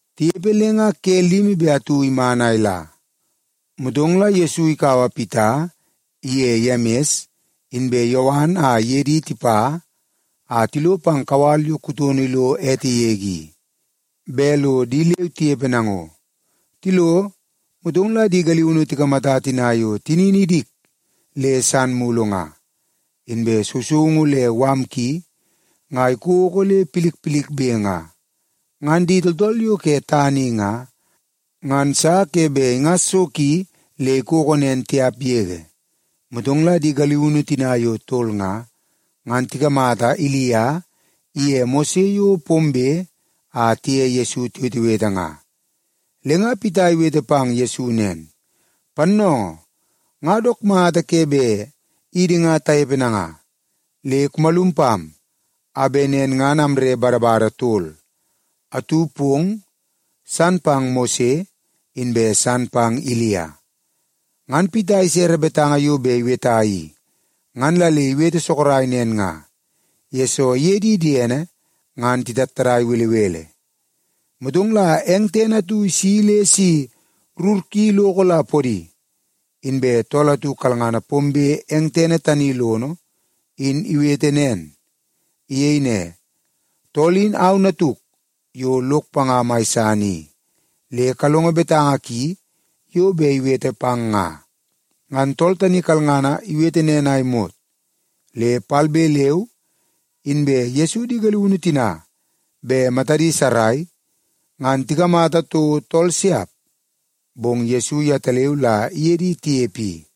Tinepe le nga ke limi be atu iman a ila, motong la Yesu ikaua Pita iye Yemis inbe Yowan a iye di tipa a tilo pang kawal yo kutono lo ete yege i, bet lo di leu tinepe nango. Tilo, motong la di galiunu tikamata tina yo tinini idik le san mulu nga. Inbe sousoungu le mala ki nga ikoko le milmilbe nga. Ngan di tooltool yo ke tana i nga, ngan sa ke bet ingas so ki le ikoko nen tiap yege. Motong la di galiunu tina yo tol nga, ngan tikamata Ilia iye Mose yo pombe a tiye Yesu tiwetewete nga. Le nga Pita iwete pang Yesu nen, “Pannoongoo, nga dook mata ke bet idi nga tanepe nanga. Le kumalum pam, a bet nen ngan amre badabada tol; atu pong, san pang Mose, inbe san pang Ilia.” Ngan Pita isere betanga yo bet iweta i, ngan la le iwete sorok nen nga, yesoo iye di diene ngan titattadai belebele. Motong la eng tene atu isi le si rur ki iloko la podi, inbe tool atu kalngana pombe eng tene tani lono in iwete nen. Iyei ne, “Tool in au Natuk yo lok panga mai san i. Le kalongo betanga ki yo bet iwete pang nga!” Ngan tool tani kalangana iwete nen a imot, le palbe leu inbe Yesu di galiunu tina bet matadi sarai, ngan tikamata toko tool siap. Bong Yesu yetaleu la iye di tinepe i.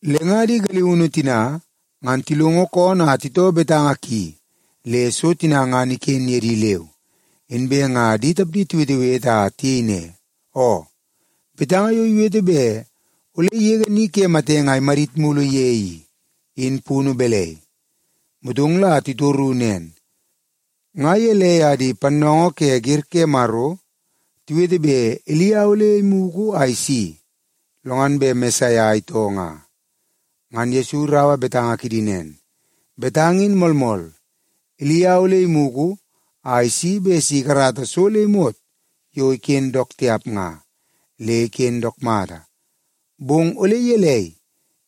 Le nga di galiunu tina ngan tilongo koonoo a titoo betanga ki le so tina ngan iken ye di leu. Inbe nga di tapdi tiwetewete a tiyei ne, “Oo, betanga yo iwete bet ole igege ni ke matenge a imadit mulu ye i, in punu balai?” Motong la titoru nen, “Nga gelei a di pannoongoo ke wer ke Maro tiwete bet Ilia ole imugu a isi, lo ngan bet Mesaia itoo nga?” Ngan Yesu iraua betanga kidi nen, “Betanga in moolmool. Ilia ole imugu a isi bet si ikarata so le imot yo iken dook tiap nga, le iken dook mata. Bong ole gelei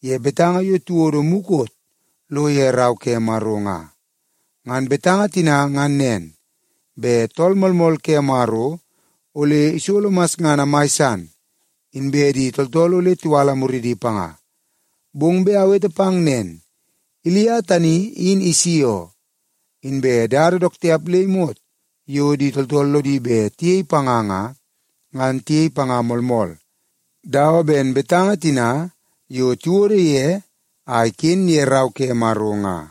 ye betanga yo tiwodo mukot lo ye Rau ke Maro nga? Ngan betanga tina ngan nen, bet Tool Moolmool ke Maro ole isolo masngana mai san, inbe di tooltool ole tiwala muridi panga. Bong bet awete pang nen, Ilia tani in isi oo. Inbe dada dook tiap le imot yo di tooltool lodi bet tiyei panga nga, ngan tiyei panga moolmool, dawa ben betanga tina yo tiwodo ye a iken ye Rau ke Maro nga.”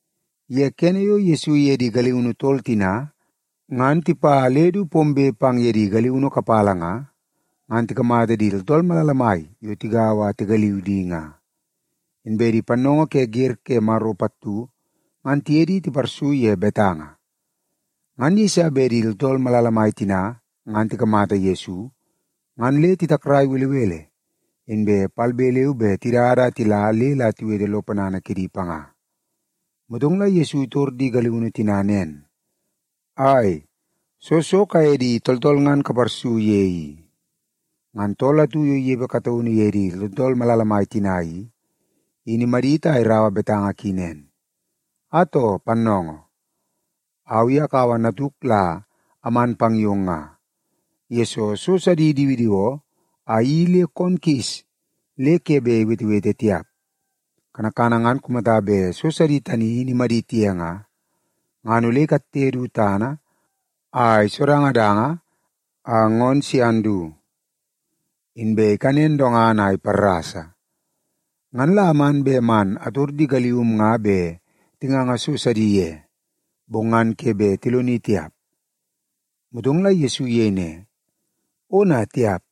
Ye kene yo Yesu iye di galiunu tol tina ngan tipa le du pombe pang ye di galiunu kapala nga, ngan tikamata di tooltool malala mai yo tigaua a tigaliu di nga. Inbe di pannoongoo ke wer ke Maro pattu ngan tiye di tiparsu ye betanga. Ngan yeiso bet di tooltool malala mai tina ngan tikamata Yesu, ngan le titakrai belebele inbe palbe leu be tidada a tila le la tiwete lo ponana kidi panga. Motong la Yesu itor di galiunu tina nen, “Ai, soo so kaye di tooltool ngan kaparsu ye i?” Ngan tool atu yo inepe kataunu ye di tooltool malala mai tina i, in imadit a iraua betanga ki nen, “Atoo, Pannoongoo, au i akaua natuk la aman pang yong nga, yesoo so sidi idiwidiwoo a iyeii le koon kis le ke bet iwetewete tiap. Kanakana ngan kumata bet so sidi tani in imadit ye nga, ngan ole ikatte du tana a isodangadanga a ngoon sian du, inbe ikanen dongana a iparrasa. Ngan la aman bet man ator di galium nga bet tinganga so sidi ye, bong ngan ke bet tiloni tiap.” Motong la Yesu iyei ne, “Ona tiap!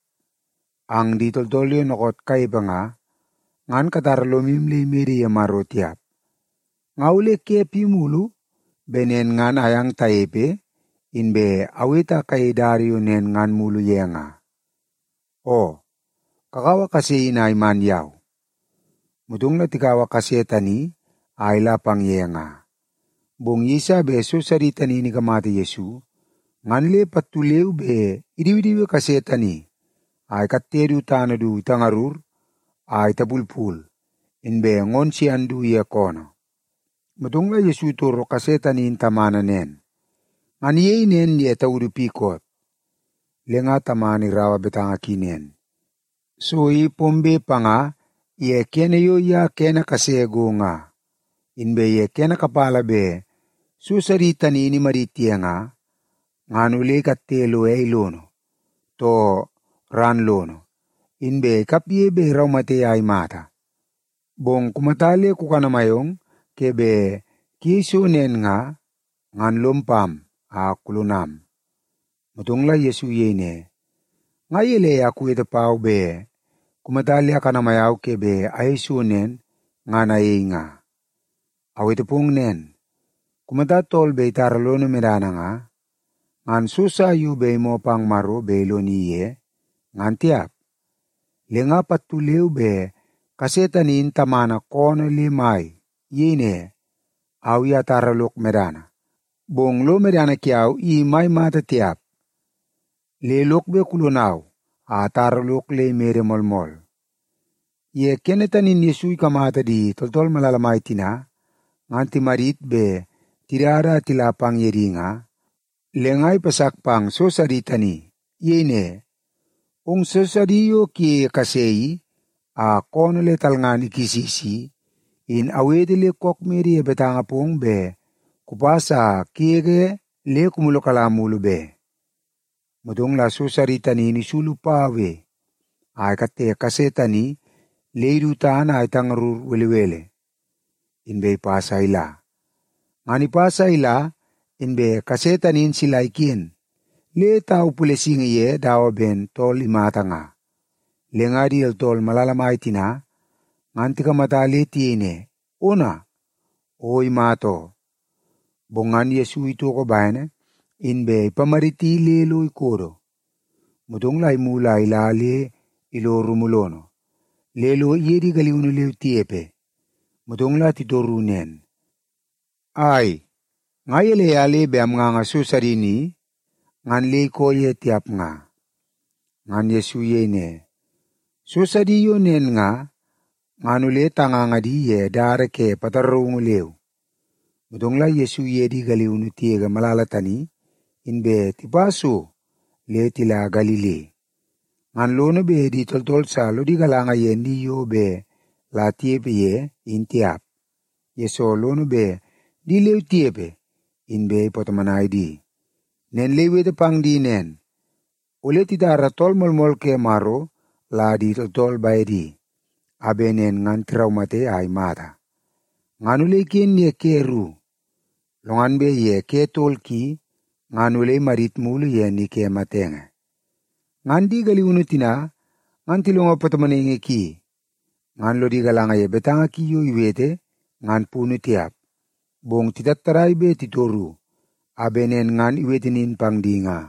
Ang di tooltool yo dookoot kanepe nga, ngan katara lomu le imede ye Maro tiap. Nga ole ke pi mulu bet nen ngan ayang tanepe inbe awete a kayei dada yo nen ngan mulu ye nga? Oo, kakaua kase in a iman yau.” Motong la tikaua kase tani a ila pang ye nga. Bong yeiso bet so sidi tani in ikamata Yesu, ngan le pattu leu be idiwidiwi kase tani a ikatte du tana du itangarur a itapulpul, inbe ngoon sian du ye koonoo. Motong la Yesu itoro kase tani in tamana nen, “Ngan iyei nen ye taudu pi koot?” Le nga tamana iraua betanga ki nen, “So i pombe panga ye kene yo ye kene kase go nga. Inbe ye kene kapala bet so sidi tani in imadit ye nga, ngan ole ikatte lo ei lono, too ran lono, inbe ikapge bet iraumate a imata. Bong kumata le kukanamai ong ke bet kuyei so nen nga, ngan lom pam a kulonam.” Motong la Yesu iyei ne, “Nga gelei a kuwete pau, bet kumata le akanamai au ke bet ayei so nen, ngan ayei nga? Awete pong nen, kumata tool bet itara lono medana nga, ngan so sa yo bet imoo pang Maro bet iloni ye, ngan tiap.” Le nga pattu leu be kase tani in tamana koonoo le mai. Iyei ne, “Au i atara lok medana, bong lo medana kiau i mai mata tiap. Le lok bet kulonau a atara lok le imede moolmool.” Ye kene tani in Yesu ikamata di tooltool malala mai tina ngan timadit bet tidada a tila pang ye di nga, le nga ipasak pang so sidi tani. Iyei ne, “Ong so sidi yo kuyeie kase i a koonoo le talngana kisis i, in awete le kook mede ye betanga pong bet kupas a kugege le kumulukala mulu be.” Motong la so sidi tani in isulu paue a ikatte kase tani le idu tana a itangarur belebele, inbe ipas a ila. Ngan ipas a ila inbe kase tani in sila iken le tau pulesingi ye dawa ben tool imata nga. Le nga di tooltool malala mai tina ngan tikamata le tiyei ne, “Ona, o imata oo.” Bong ngan Yesu itoko bene inbe ipamaditi le lo ikodo. Motong la imulu a ila le ilo rumu lono, le lo iye di galiunu leu tinepe. Motong la titoru nen, “Ai, nga gelei a le bet amnganga so sidi ni, ngan le ikoo ye tiap nga?” Ngan Yesu iyei ne, “So sidi yo nen nga, ngan ole tanganga di ye dada ke pataraungu leu.” Motong la Yesu iye di galiunu tigege malala tani, inbe tipa so le tila tana mai Galili. Ngan lono bet di tooltool sa lodi galanga ye ni yo bet la tinepe ye in tiap, yesoo lono bet di leu tinepe inbe ipatomonai di. Nen le iwete pang di nen, “Ole titara Tool Moolmool ke Maro la di tooltool bedi, a bet nen ngan tiraumate a imata. Ngan ole iken ye ke ru, lo ngan bet ye ke tol ki, ngan ole imadit mulu ye ni ke matenge.” Ngan di galiunu tina ngan tilongo patomonaingi ki, ngan lodi galanga ye betanga ki yo iwete ngan punu tiap. Bong titattadai bet titoru, a bet nen ngan iwete nin pang di nga.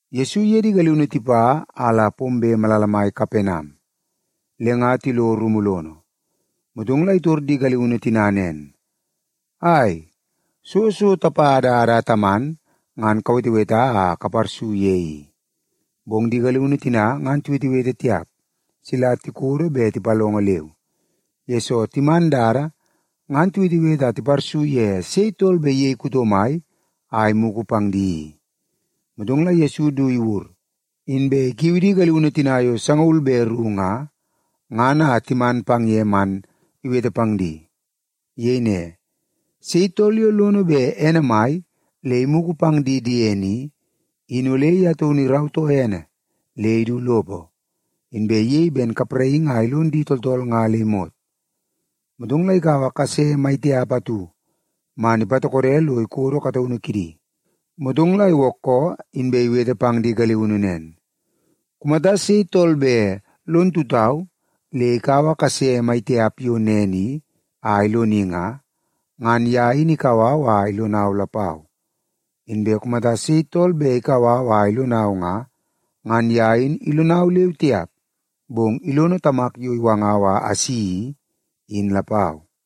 Yesu iye di galiunu tipa a la pombe malala mai Kapenam, le nga tilo rumu lono. Motong la itor di galiunu tina nen, “Ai, soo so tapa dada a taman ngan kaweteweta a kaparsu ye i?” Bong di galiunu tina ngan tiwetewete tiap, sila tikodo be tipalongo leu, yesoo timan dada ngan tiwetewete a tiparsu ye sei tool bet iyei kuto mai a imugu pang di i. Motong la Yesu du iwur, inbe ikiu di galiunu tina yo sangaul be ru nga, ngan a timan pang ye man iwete pang di. Iyei ne, “Sei tool yo lono bet ene mai le imugu pang di diene i, in ole ye taunu irautoo ene le idu lopo, inbe iyei ben kapraingi a ilon di tooltool nga le imot.” Motong la ikaua kase mai tiap atu man ipatokode lo ikodo kataunu kidi. Motong la iwookoo, inbe iwete pang di galiunu nen, “Kumata sei tool bet lon tutau le ikaua kase mai tiap yo nen i a iloni nga, ngan ye in ikau au a ilonau lapau. Inbe kumata sei tool bet ikau au a ilonau nga, ngan ye in ilonau leu tiap, bong ilono Tamak yo iwangau a asi i, in lapau.”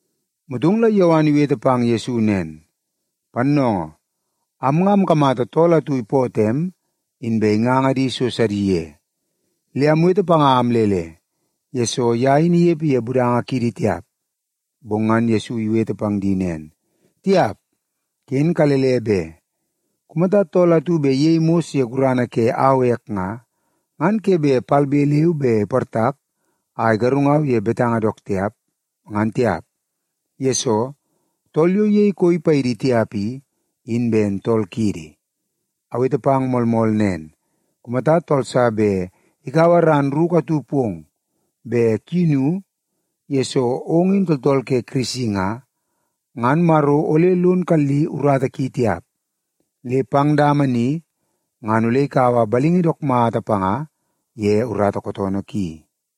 Motong la Yowan iwete pang Yesu nen, “Pannoongoo, am nga amkamata tool atu ipootoo em, inbe inganga di so sidi ye. Le amwete panga a amlele, yesoo ye in inepe ye budanga kiidi tiap.” Bong ngan Yesu iwete pang di nen, “Tiap, ken kalele be! Kumata tool atu bet iyei mos ye gurana ke au ek nga, ngan ke bet palbe leu be iportak a igarungau ye betanga dook tiap, ngan tiap. Yesoo, tool yo iyei koi paidi tiap i, in ben tool kiidi. Awete pang moolmool nen, kumata tool sa bet ikaua ran ruku atu pong bet kuyinu yesoo ong in tooltool ke Kirisi nga, ngan Maro ole lon kali urata ki tiap, le pang dama ni ngan ole ikaua balingi dook mata panga ye urata kootoonoo ki.”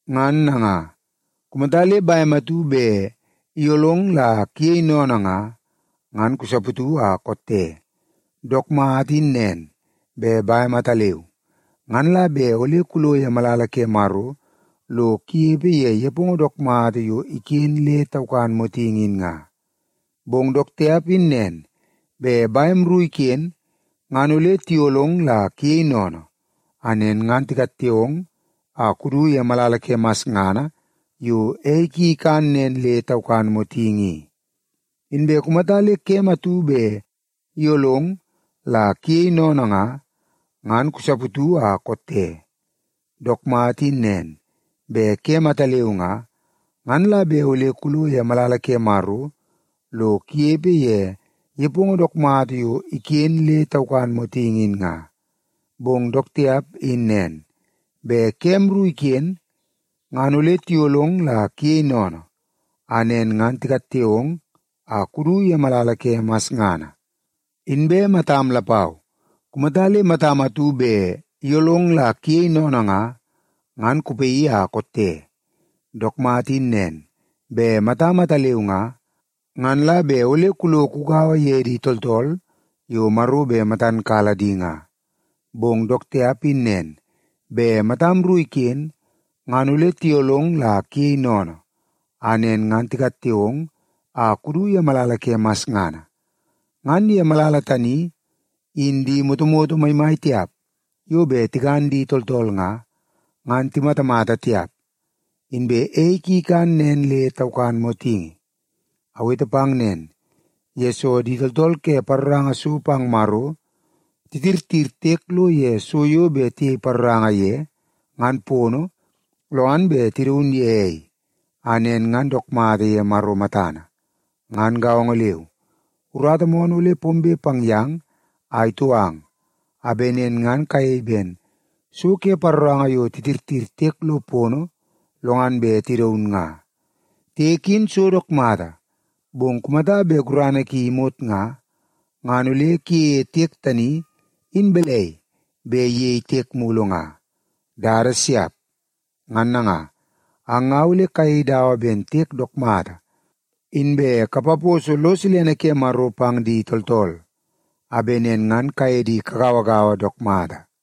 Ngan nanga, kumata le bem atu bet iyolong la kuyei sennene nga, ngan kusaputu a kotte. Dook mata in nen, bet bem ataleu, ngan la bet ole kulo ye malala ke Maro lo kunepe ye nepongo dook mata yo iken nen le taukan motingi in nga. Bong dook tiap in nen, bet bem ru iken ngan ole tiyolong la kuyei sennene, a nen ngan tikatte ong a kudu ye malala ke masngana yo ei ki ikan nen le taukan motingi i. Inbe kumata le kem atu bet iyolong la kuyei sennene nga, ngan kusaputu a kotte. Dook mata in nen, bet kem ataleu nga, ngan la bet ole kulo ye malala ke Maro lo kunepe ye nepongo dook mata yo iken nen le taukan motingi in nga. Bong dook tiap in nen, bet kem ru iken ngan ole tiyolong la kuyei sennene, a nen ngan tikatte ong a kudu ye malala ke masngana. Inbe matam lapau, kumata le matam atu bet iyolong la kuyei sennene nga, ngan kupaii a kotte. Dook mata in nen, bet matam ataleu nga, ngan la bet ole kulo kugaua ye di tooltool yo Maro bet matan kala di nga. Bong dook tiap in nen, bet matam ru iken ngan ole tiyolong la kuyei sennene, a nen ngan tikatte ong a kudu ye malala ke masngana. Ngan ye malala tani, in ‘di motomoto maimai tiap yo bet tikan di tooltool nga, ngan timatamata tiap. Inbe ei ki ikan nen le taukan motingi.’ “Awete pang nen, yesoo di tooltool ke paroranga so pang Maro titirtir tiek lo ye so yo bet tiyei paroranga ye, ngan pono, lo ngan bet tidaun ye ei, a nen ngan dook mata ye Maro matana. Ngan gaongo leu, urata moonoo ole pombe pang yang a itou ang, a bet nen ngan kayei ben so ke paroranga yo titirtir tiek lo pono lo ngan bet tidaun nga. Tiek in so dook mata, bong kumata bet gurana ki imot nga, ngan ole kuyeie tiek tani in balai bet iyei tiek mulu nga? Dada siap! Ngan nanga, ang nga ole kayei dawa ben tiek dook mata, inbe kapaposo lo silene ke Maro pang di tooltool, a bet nen ngan kaye di kagauagaua dook mata.”